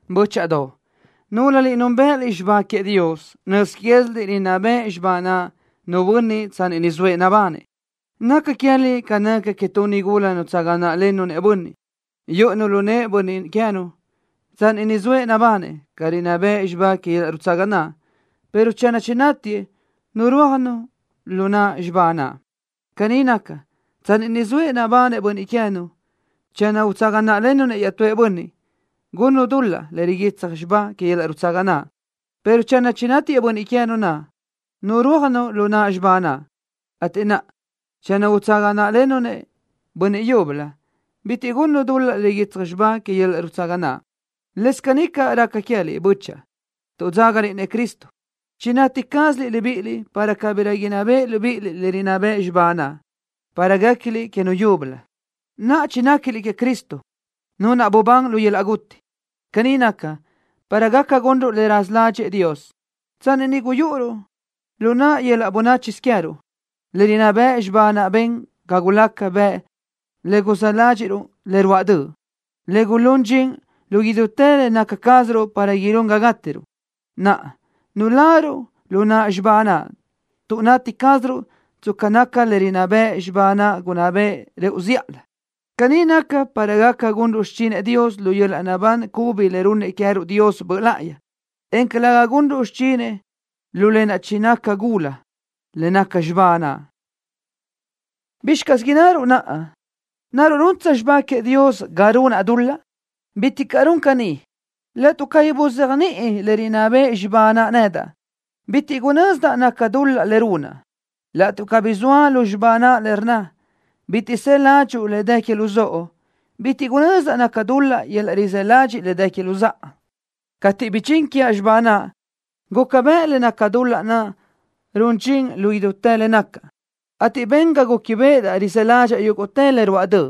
Bö́chaʼadoʼ, núlöliʼ núnbëʼëliʼ xibá queëʼ Dios. Nöz quéziliʼ rinná beʼe xibá naʼ nu bönniʼ tsanni ni zoëʼ nabanëʼ. Naca queë́liʼ ca naca que tu nigula nutsaga náʼlennu-nëʼ bönniʼ, yúʼunu lu nëʼë bönniʼ queë́nu tsanni ni zoëʼ nabanëʼ ca rinná bëʼ xibá que yöl-laʼ nutsaga naʼ, pero channö chinátiëʼ, nurúajnu lu naʼ xibá naʼ. Caní naca, tsanni ni zoëʼ nabanëʼ bönniʼ queë́nu, channö utsaga náʼlennu-nëʼ iaʼtúëʼ bönniʼ, gunnu dul-laʼ le riguitsaj xibá que yöl-laʼ nutsaga naʼ, pero channö chinátiëʼ bönniʼ queë́nu naʼ, nurúajnu lu naʼ xibá naʼ, ateʼ naʼa, channö utsaga náʼlennu-nëʼ nu bönniʼ yúbölö, bitiʼ gunnu dul-laʼ le riguitsaj xibá que yöl-laʼ nutsaga naʼ. Lëscaʼ caní raca queë́liʼ, bö́chaʼa. Tuʼ dzágaliʼ-nëʼ Cristo chinati cázaliʼ libíʼiliʼ para cabirö inná beʼe libíʼiliʼ le rinná bëʼ xibá naʼ, para guéquiliʼ que Nu yúbölö. Naʼa chinéquiliʼ queëʼ Cristo, Nu naʼ bubán lu yöl-laʼ guti. Caní naca, para gaca gunruʼ le raza ládxëʼë Dios. Tsanni niʼ guyúʼuruʼ lu naʼ yöl-laʼ bönáchisö queë́ruʼ, le rinná bëʼ xibá naʼ ben ga gulaca bëʼ le guzë́ ládxiʼruʼ le ruáʼ döʼ, le gulún dxin lu idútë le naca cázaruʼ para ilún ga gátiruʼ. Naʼa nuláruʼ lu naʼ xibá naʼ tuʼ nati cázaruʼ tsca naca le rinná bëʼ xibá naʼ gunná beʼe rëʼu zíʼalö. Caní naca para gaca gunruʼ xichinëʼ Dios lu yöl-laʼ naʼbán cubi le runnëʼ queë́ruʼ Dios Böʼ Láʼayi, en calëga gunruʼ xichinëʼ lu lë naʼ chinaca gula, le naca xibá naʼ. ¿Bizxi caz innaruʼ naʼa? ¿Naruʼ runtsö xibá queëʼ Dios ga runaʼ dul-laʼ? ¡Bitiʼ caʼ run caní! Laʼtuʼ cabí buzéajniʼi le rinná bëʼ xibá naʼ nedaʼ, bitiʼ gunözdaʼ naca dul-laʼ le runaʼ. Laʼtuʼ cabí zoa lu xibá naʼ le rnna: “Bitiʼ së ládxuʼu le dë que luzóʼo”, bitiʼ gunözdaʼ naca dul-laʼ yöl-laʼ rizë́ ladxiʼ le dë que luzáʼa. Cateʼ bidxín quiaʼ xibá naʼ, guca bëʼ le naca dul-laʼ naʼ run dxin lu idútë le nacaʼ, ateʼ ben ga gúquibeʼedaʼ rizë́ ládxaʼa yúguʼtë le ruáʼ döʼ.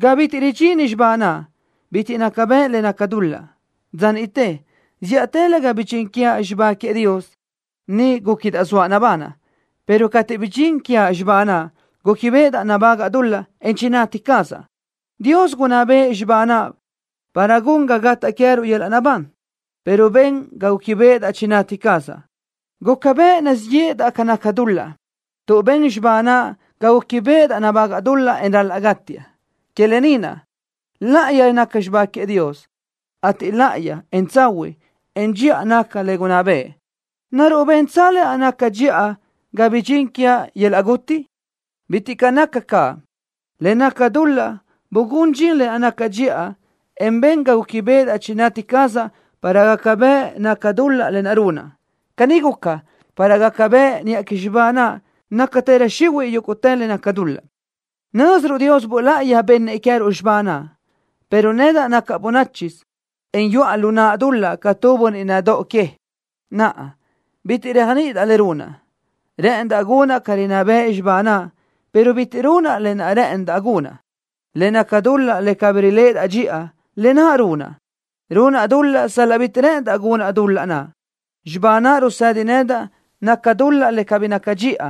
Ga bitiʼ ridxini xibá naʼ, bitiʼ naca bëʼ le naca dul-laʼ. Dza niʼte, zíʼatëlö ga bidxín quiaʼ xibá queëʼ Dios, niʼ gúquidaʼ zoaʼ nabanaʼ, pero cateʼ bidxín quiaʼ xibá naʼ, gúquibeʼedaʼ nabágaʼa dul-laʼ, en chinati cazaʼ. Dios gunná bëʼë xibá naʼ para gun ga gataʼ queë́ruʼ yöl-laʼ naʼbán, pero ben ga gúquibeʼedaʼ chinati cazaʼ. Guca bëʼ nazíʼ yéʼedaʼ ca naca dul-laʼ, tuʼ ben xibá naʼ ga gúquibeʼedaʼ nabágaʼa dul-laʼ, en ral-laʼ gátiaʼ. Que lë ni naʼ, láʼayi naca xibá queëʼ Dios, ateʼ láʼayi, en tsahuiʼ, en dxiʼa naca le gunná bëʼë. ¿Naruʼ bentsö lë naʼ naca dxiʼa ga bidxín quiaʼ yöl-laʼ guti? ¡Bitiʼ caʼ naca caʼ! Le naca dul-laʼ bugún dxin lë naʼ naca dxiʼa, en ben ga gúquibeʼedaʼ chinati cazaʼ para gaca bëʼ naca dul-laʼ le runaʼ. Caní guca, para gaca bëʼ niʼa que xibá naʼ nácatërö xihuiʼ yúguʼtë le naca dul-laʼ. Nö́ziruʼ Dios Böʼ Láʼayi bennëʼ queë́ruʼ xibá naʼ, pero nedaʼ nacaʼ bönáchisö, en yuʼa lu naʼ dul-laʼ ca tu bönniʼ nadóʼo que. Naʼa, bitiʼ réajniʼidaʼ le runaʼ. Rë́ʼëndaʼ gunaʼ ca rinná bëʼ xibá naʼ, pero bitiʼ runaʼ lë naʼ rë́ʼëndaʼ gunaʼ. Le naca dul-laʼ le cabí riléʼedaʼ dxiʼa, lë naʼ runaʼ. Runaʼ dul-laʼ sal-laʼ bitiʼ rë́ʼëndaʼ gunaʼ dul-laʼ naʼ. Xibá naʼ rusëdi nedaʼ naca dul-laʼ le cabí naca dxiʼa.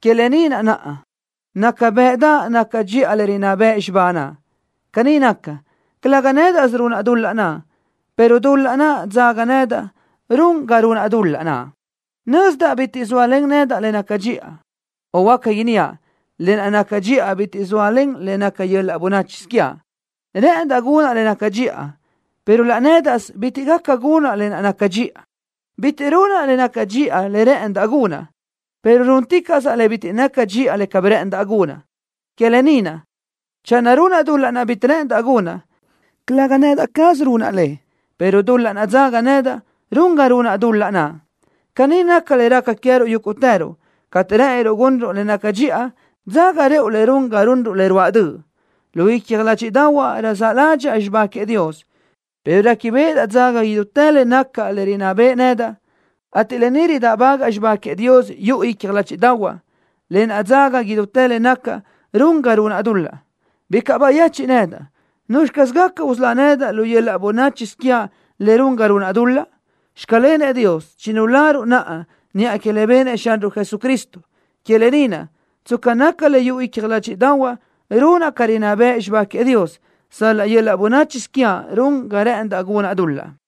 Que lë ni naʼ naca bëʼdaʼ naca dxiʼa le rinná bëʼ xibá naʼ. Caní naca, calëga nédaʼsö runaʼ dul-laʼ naʼ, pero dul-laʼ naʼ dzaga nedaʼ run ga runaʼ dul-laʼ naʼ. Nözdaʼ bitiʼ zóalen nedaʼ le naca dxiʼa, o huáca inníaʼ, lë naʼ naca dxiʼa bitiʼ zóalen le naca yöl-laʼ bönáchisö quiaʼ. Rë́ʼëndaʼ gunaʼ le naca dxiʼa, pero laʼ nédaʼsö bitiʼ gaca gunaʼ lë naʼ naca dxiʼa. Bitiʼ runaʼ le naca dxiʼa le rë́ʼëndaʼ gunaʼ, pero rúnticaʼsaʼ le bitiʼ naca dxiʼa le cabí rë́ʼëndaʼ gunaʼ. Que lë ni naʼ, channö runaʼ dul-laʼ naʼ bitiʼ rë́ʼëndaʼ gunaʼ, calëga nedaʼ caz runaʼ le, pero dul-laʼ naʼ dzaga nedaʼ run ga runaʼ dul-laʼ naʼ. Caní naca le raca queë́ruʼ yúguʼtëruʼ. Cateʼ rë́ʼëniruʼ gunruʼ le naca dxiʼa, dzaga rëʼu le run ga runruʼ le ruáʼ döʼ. Lu icja ládxiʼdaʼahuaʼ raza ládxaʼa xibá queëʼ Dios pero réquibeʼedaʼ dzaga idútë le nacaʼ le rinná beʼe nedaʼ, ateʼ lë ni ridáʼbagaʼ xibá queëʼ Dios yuʼu icja ládxiʼdaʼahuaʼ. Lë naʼ dzaga idútë le nacaʼ run ga runaʼ dul-laʼ. ¡Bicaʼ bayechiʼ nedaʼ! ¿Nuzxi caz gaca usölá nedaʼ lu yöl-laʼ bönáchisö quiaʼ le run ga runaʼ dul-laʼ? ¡Xclenëʼ Dios, chinularuʼ naʼa niʼa que le benëʼ Xanruʼ Jesucristo! Que lë ni naʼ, tsca naca le yuʼu icja ládxiʼdaʼahuaʼ runaʼ ca rinná bëʼ xibá queëʼ Dios, sal-laʼ yöl-laʼ bönáchisö quiaʼ run ga rë́ʼëndaʼ gunaʼ dul-laʼ.